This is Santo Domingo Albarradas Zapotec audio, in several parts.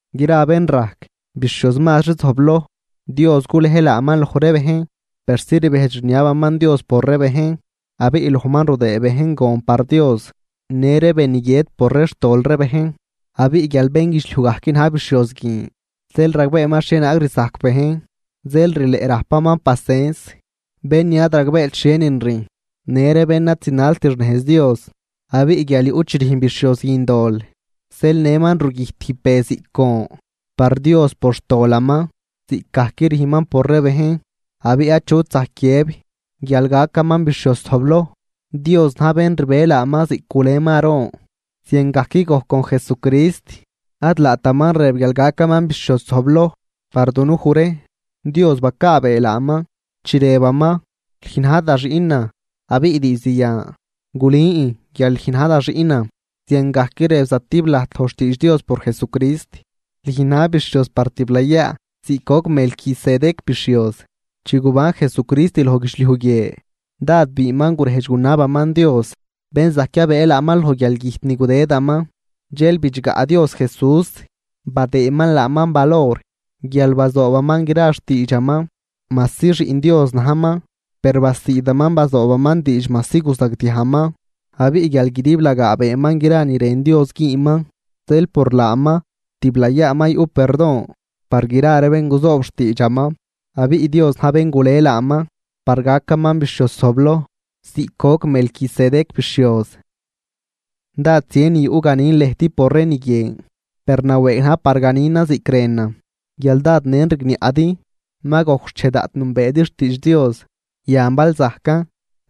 Gra bén rajc bixhioz mazri zojbloj, Dios gulej laaman loj ree bejn persi rbejdx rniabaman Dios por ree bejn. Abiꞌ lojman rudëë bejn gon par Dios në ree be ni guiët por ree xtol ree bejn. Abiꞌ guial bénguidxliuj gajc na̱j bixhioz guin, zeel ragbeeman xhienaag rzajc bejn. Zeel rileꞌ rajpaman pacens bén ni ad ragbeet xhienin rüjn, në ree bén ad zinalt xnejz Dios. Abiꞌ guial yuꞌ chi rüjn bixhioz guin dol zeel nëman rugüjt tijb be ziꞌc gon par Dios por xtolaman, ziꞌcgajc rüjnman por ree bejn. Abiꞌ achut zajc guiëb guial gacaman bixhioz zojbloj, Dios na̱j bén rbe laaman ziꞌc guleman Aarón. Ziangajc gojc con Jesucrist, ad laataman rëb guial gacaman bixhioz zojbloj par dunuj ree, Dios bacaabee laaman, chi rëbaman: Lüj na̱j da Xiꞌnan, abiꞌ diizd yan gulün guial lüj na̱j da Xiꞌnan. Ziangajc rëb zatib lajt loj xtiidx Dios por Jesucrist: Lüj na̱j bixhioz par tiblayaa ziꞌc goc Melquisedec bixhioz. Chi guban Jesucrist loj guidxliuj guie dád biinman gurejdx gunabaman Dios bén zajc yabëë laaman loj guialgüjt ni gudëdaman. Dxel bidxgaꞌ Dios Jesús badëëman laaman valor guial bazoobaman gra xtiidxaman. Majsi Xiꞌn Dios najman, per basiidaman bazoobaman diidx majsi guzagdiajman. Abiꞌ guial guidiblagaa beenman gra ni rën Dios güünman, zeel por laaman tiblayaa ma yuꞌ perdon par gra ree bén guzoob xtiidxaman. Abiꞌ Dios na̱j bén gule laaman par gacaman bixhioz zojbloj ziꞌc goc Melquisedec bixhioz. Dád zien ni yuꞌ ganin lëjt por ree ni guin, per nawëëg najn par ganinan ziꞌc rënan guial dád nen rigniaꞌdi. Ma gojc xchej daꞌt nünbeedi xtiidx Dios, yan bal zajcan,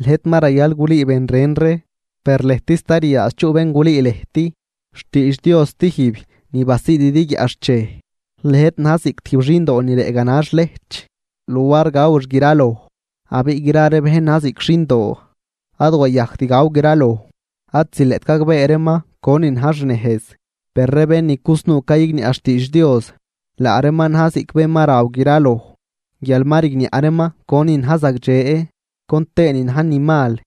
lëjt ma rayal gulüü ben ren ree, per lëjt sta ryaadx chuꞌ bén gulüü lëjt xtiidx Dios stijb ni basiididi guiaꞌxchej. Lëjt na̱j ziꞌc tijb xindoo ni rëꞌ ganax lejch luar gawix graloj. Abiꞌ gra ree bén na̱j ziꞌc xindoo ad wayajct gaw graloj, ad zileꞌt gagbee reeman conin na̱j xnejz. Per ree bén ni cusnuu cayigniaꞌ xtiidx Dios, laa reeman na̱j ziꞌc bén ma raw graloj guial ma rigniaꞌ reeman conin na̱j zagdxe con tëënin na̱j ni mal.